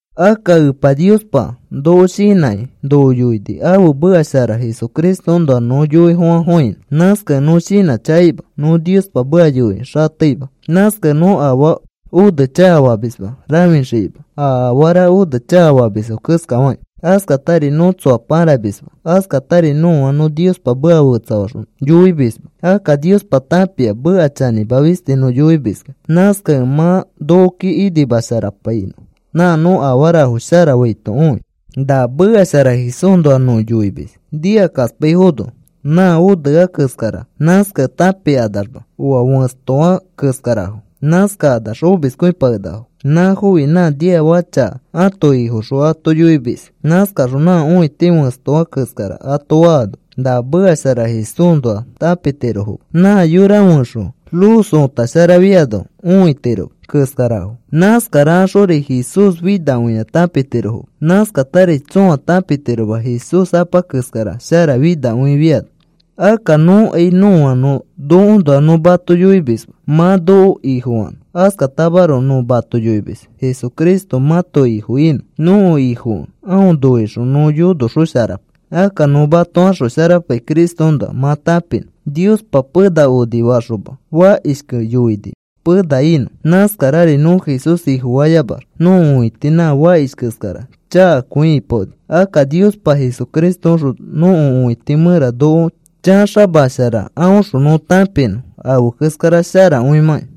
Akka Epa Niospa noko shinãkĩ noko yoini ãfe meka shara Jesucristoõnoa nõ yoifofãfofãinõ. Nãskakẽ nõ shinãchakaima, nõ Niospa meka yoiki xateima. Nãskakẽ nõ afaa one chakafamisma rãfixikima, a afara one chakafamisfo keskafakĩ. Askatari nõ tsoa pãramisma. Askatari nõa nõ Niospa meka fetsafaxõ yoimisma. Akka Niospa tãpia meka chanĩma fisti nõ yoimiskẽ. Nãskakẽ mã nokoki inimasharapainõ, nã nõ afarafo shara faito õi. Na meka shara Jesúsnoa nõ yoimis nikakaspaifono nã onea keskara. Nãskakẽ tãpikanamax oa fẽstoa keskarafo. Nãskakanax omiskõipakenakafo. Nãfofi nã niafaka chaka ãto ifoxõ ato yoimis. Nãskaxõ nã õiti fẽstoa keskara ato faano na meka shara Jesúsnoa tãpitirofoma. Nã yora fẽxõ luz ota sharafiano õitiroma keskarafo. Nãskarakaxori Jesús finakõia tãpitirofoma. Nãskatari tsõa tãpitiroma Jesús Apa keskara sharafinakõifiano. Akka nõkai nõa nõ nokoõnoa nõ mato yoimisma mã noko ifofanõ. Askatamaroko nõ mato yoimis Jesucristo mãto Ifo inõ. Nõko Ifokẽ aõ noixõ nõ yonoxosharapai. Akka nõ mato axosharapai Cristoõnoa mã tãpinõ. Niospa pena onifayoxoma fakishkẽ yoini pena inõ. Nãskarari nõ Jesús Ifofayamax nõko õiti nã fakish keskara chakakõi ipaoni. Akka Niospa Jesucristoõxõ nõko õiti mẽra noko chaxamashara aõxõ nõ tãpinõ afe keskara sharakõimãki.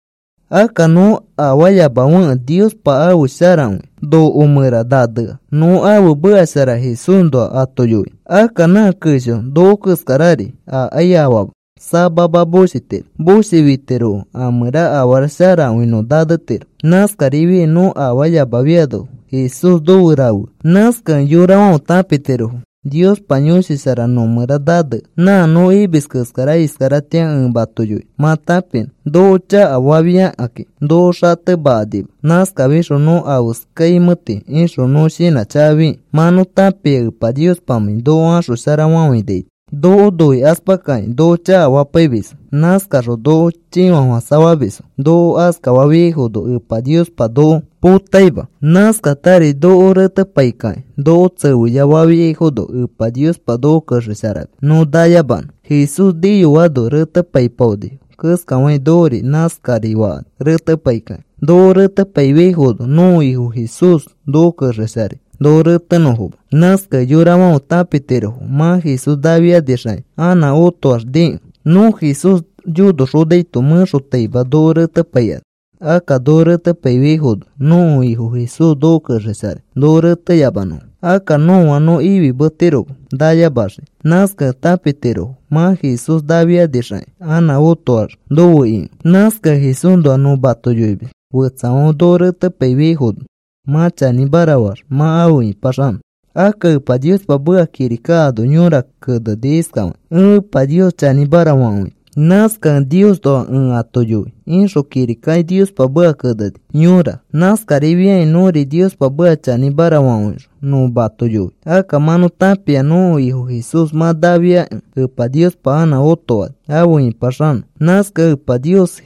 Akka nõ afaayamafekẽ Niospa ãfe sharakõi noko mẽra nanea nõ ãfe meka shara Jesúsnoa ato yoinõ. Akka nã kesho noko keskarari akai afaama. Samama moshitiro. Moshifitirokẽ a mẽra afara sharakõi nõ nanetiro. Nãskarifiai nõ afaayamafiano Jesús nofe rafea. Nãskakẽ yorafãfe tãpitirofo Niospa Yõshi Shara nõmẽra nanea. Nã nõ imis keskara iskaratĩa ẽ mato yoinõ mã tãpinõ. Noko chakafafiakakĩ noko xatemakanima. Nãskafixõ nõ afeskaimẽti ixõ, nõ shinãchakafikĩ mã nõ tãpia Epa Niospamãi noko axosharafafainaito. Noko noikaspakakĩ noko chakafapaimisfo. Nãskakaxõ noko chĩfafofãsafamisfo. Noko askafafiaifono Epa Niospa noko potaima. Nãskakatari noko retepaikakĩ noko tsefeya fafiafono Epa Niospa noko kexesharamis nõ nayamanõ. Jesús niyoano retepaipaonifo keskafakĩ nokori nãskari fakani retepaikakĩ. Noko retepaifiaifono nõko Ifo Jesús noko kexesharai noko retenõfoma. Nãskakẽ yorafãfe tãpitirofo mã Jesús nafianixakĩ anã otoax nikẽ. Nõ Jesús yonoxonaito mẽxotaima noko retepaikani. Akka noko retepaifiaifono nõko Ifo Jesús noko kexesharai noko reteyamanõfo. Akka nõa nõ ifimetiroma nayamaxiki. Nãskakẽ tãpitirofo mã Jesús nafianixakĩ anã otoax nofe ikẽ. Nãskakẽ Jesúsnoa nõ mato yoimis fetsafãfe noko retepaifiaifono mã chanĩmara faax mã afe ĩpaxanõ. Akka Epa Niospa meka kirika ano yõra keneni iskafakĩ: “Ẽ Epa Nios chanĩmara fakõini. Nãskakẽ Niosnoa ẽ ato yoi,” ixõ kirikaki Niospa meka keneni yõra. Nãskarifiakĩ nõri Niospa meka chanĩmara fakõixõ nõ mato yoi. Akka mã nõ tãpia nõko Ifo Jesús mã nafiakẽ Ẽpa Niospa anã õtofani afe ĩpaxanõ. Nãskakẽ Apa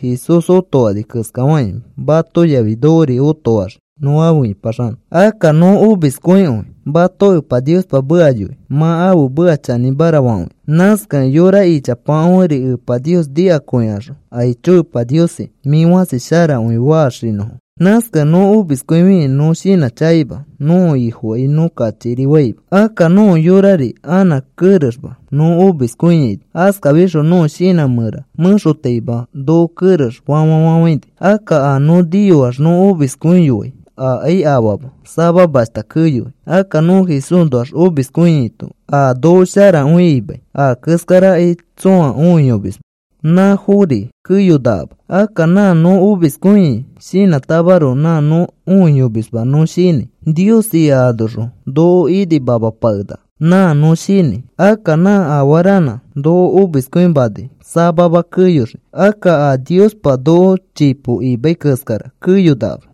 Jesús otofani keskafakĩ mato yafi nokori otofaxii nõ afe ĩpaxanõ. Akka nõ omiskõikõi mato Epa Niospa meka yoi mã ãfe meka chanĩmara fakõinõ. Nãskakẽ yora ichapafãferi Epa Nios nikakõikaxõ, “Aicho, Epa Niosi, mĩ fãsi sharakõi,” faxinõfo. Nãskakẽ nõ omiskõifikĩ nõ shinãchakaima. Nõko Ifokai nõ kachikiri faima. Akka nõko yorari anã kerexma nõ omiskõiaino. Askafixõ nõko shinã mẽra mẽxotaima noko kerex fafafãini. Akka a nõ niyoax nõ omiskõiyoai akai afaama, samamashta keyoi. Akka nõ Jesúsnoax omiskõiaito a noko sharakõi imai a keskarakai tsõa õiyomisma. Nãfori keyonakama. Akka nã nõ omiskõiai shinãtamaroko nã nõ õiyomisma nõ shinãi. Nios ika anoxõ noko inimamapakenaka. Nãa nõ shinãi. Akka nã afaranã noko omiskõimanai samama keyoxii. Akka a Niospa noko chipo imai keskara keyonakama.